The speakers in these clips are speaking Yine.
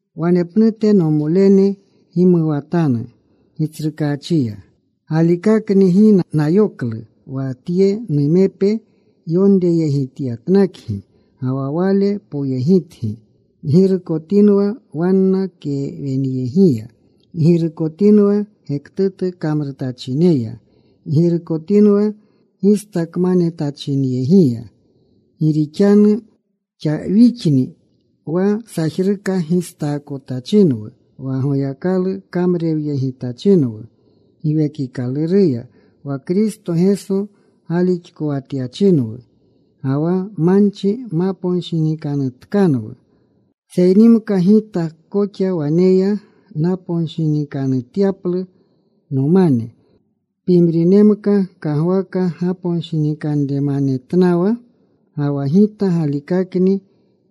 Wanepnute, nomolene, gimuwatanu Gitsrukaachiya. Galikakni gi nayoklu wa tye numepe yonreyegityatnakgi ga wa wale poyegitgi. Ggirukotinwa wanna kewenyegiya. Ggirukotinwa gektutu kamrutachinyegiya. Ggirukotinwa gistakmanetachinyegiya. Gi rixanu wixakni wa sajruka gistaakotachinwu, wa Goyakalu kamrurewyegitachinwu Giwekikaluruya, wa Kristo Geso galixkowatyachinwu, ga wa manchi maponshinikanutkanwu. Seynimka gita koxa waneya naponshinikanutyaplu nomane. Pimrinemka kagwaka gaponshinikanremanetnawa, ga wa gita galikakni.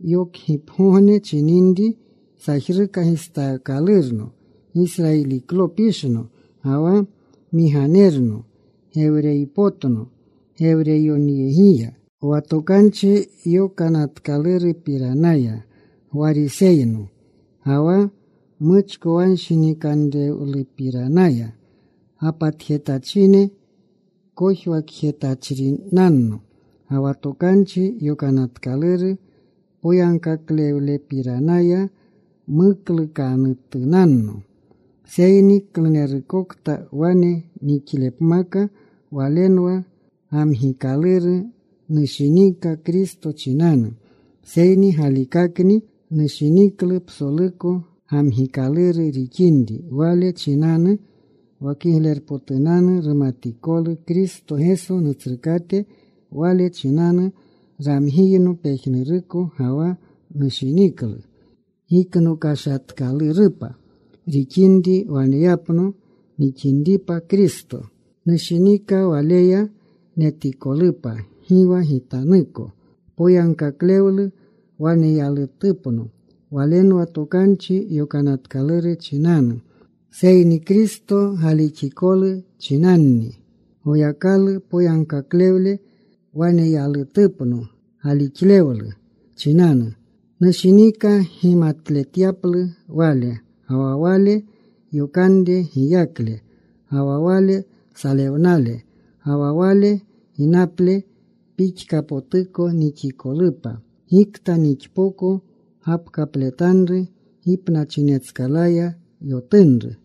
Yokgipgogne chininri, sajruka gistaakalurno. Gisrayiliklopishno. Ga wa Migaminerno. Gewreypotno Gewreyoneyegiya. Wa Tokanchi Yokanatkalurupiranaya Gwariseyno. Ga wa muchkowanshinikanrewlupiranaya gapatjetachine kojwakjetachrinanno. Ga wa Tokanchi Yokanatkaluru poyagkaklewlepiranaya, mukluukatunanno. Seyni klunerkakakokta wane nixlepmaka, walenwa gamgikaluru nushinika Kristo chinanu. Seyni galikakakni nushiniklu psoluko gamgikaluru rixinri wale chinanu wa kiglerpotunanu rumatikolu Kristo Geso Nutsrukate. Wale chinanu ramgiyno pejnuruko, ga wa nushiniklu giknokashatkalurupa rixinri waneyapno nixinripa Kristo. Nushinika Waleya netikolupa, gi wa gitanuko poyagkaklewle waneyalutupno. Walenwa Tokanchi Yokanatkaluru chinanu. Seyni Kristo galixikolu chinanni, Goyakalu poyagkaklewle waneyalutupno galixlewlu chinanu. Nushinika gimatletyaplu Wale, ga wa Wale yotunre giyakle, ga wa Wale salewnale. Ga wa Wale gipnale pixkapotuko nixikolupa. Gikta nixpoko gapkapletanru gipnachinetskalaya yotunru.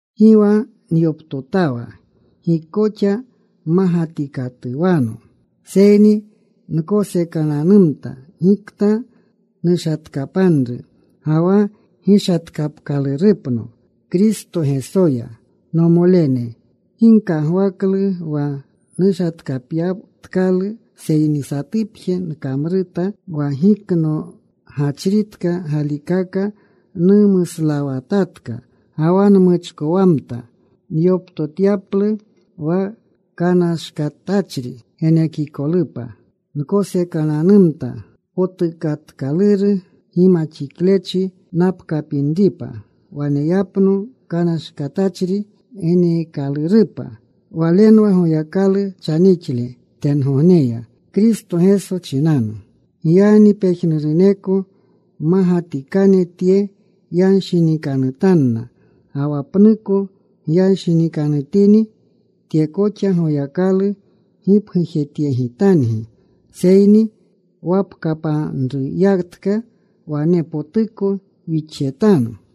Gi wa nyoptotawa. Gi koxa mmagatikatuwano. Seyni nkosekananumta gikta nushatkapanru, ga wa gishatkapkalurupno Kristo Gesoya. Nomolene, gi nkagwaklu wa nushatkapyatkalu. Seyni satupje nkamruta. Wa giknogachritka galikaka numuslawatatka, ga wa nmuchkowamta nyoptotyaplu wa kanashkatachri genekikolupa. Nkosekananumta potukatkaluru gimaxiklechi napkapinripa, waneyapno kanashkatachri geneekalurupa. Walenwa Goyakalu chanixle tengogneya Kristo Geso chinanu. Giyagni pejnuruneko mmagatikane tye yanshinikanutanna. Ga wa pnuko gyanshinikanutini, tye koxa Goyakalu gipgujetyegitangi. Seyni wapkapanruyatka wanepotuko wixjetanu.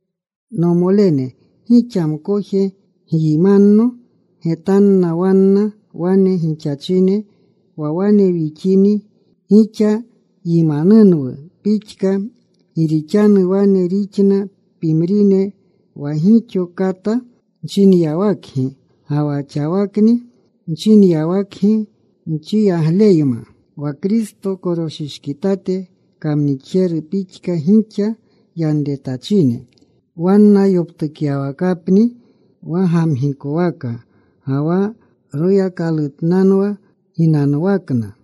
Nomolene, gixa mkoje gyimanno. Getanna wanna wane gixachine wa wane wixini gixa yimanunwu pixka. Gi rixanu wane rixna pimrine wa gixo kata nchinyawakgi ga wa xawakni nchinyawakgi nchiyagleyma, wa Kristo koroshishkitate kamnixjene pixka gixa yanretachine. Wanna yoptukyawakapni wa gamgikowaka. Ga wa royakalutnanwa ginanwakna.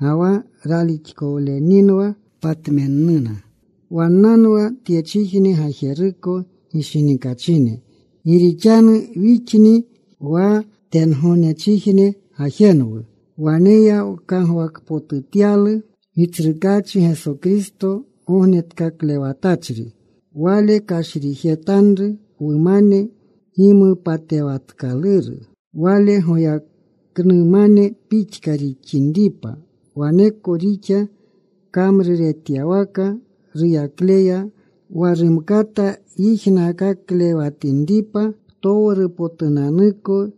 Ga wa ralixkowleninwa patmennuna. Wannanwa tyechijne gajeruko gishinikachine. Gi rixanu wixni wa tengognechijne gajenwu. Waneya wkagwakpotutyalu Gitsrukaachi Geso Kristo Gognetkaklewatachri. Wale kashrijetanru wumane gimupatewatkaluru Wale goyaknumane pixka rixinripa. Waneko rixa kamruretyawaka ruyaklelya, wa rumkata yijnaakaklewatinripa ptowrupotunanuko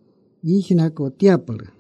yijnakotyaplu.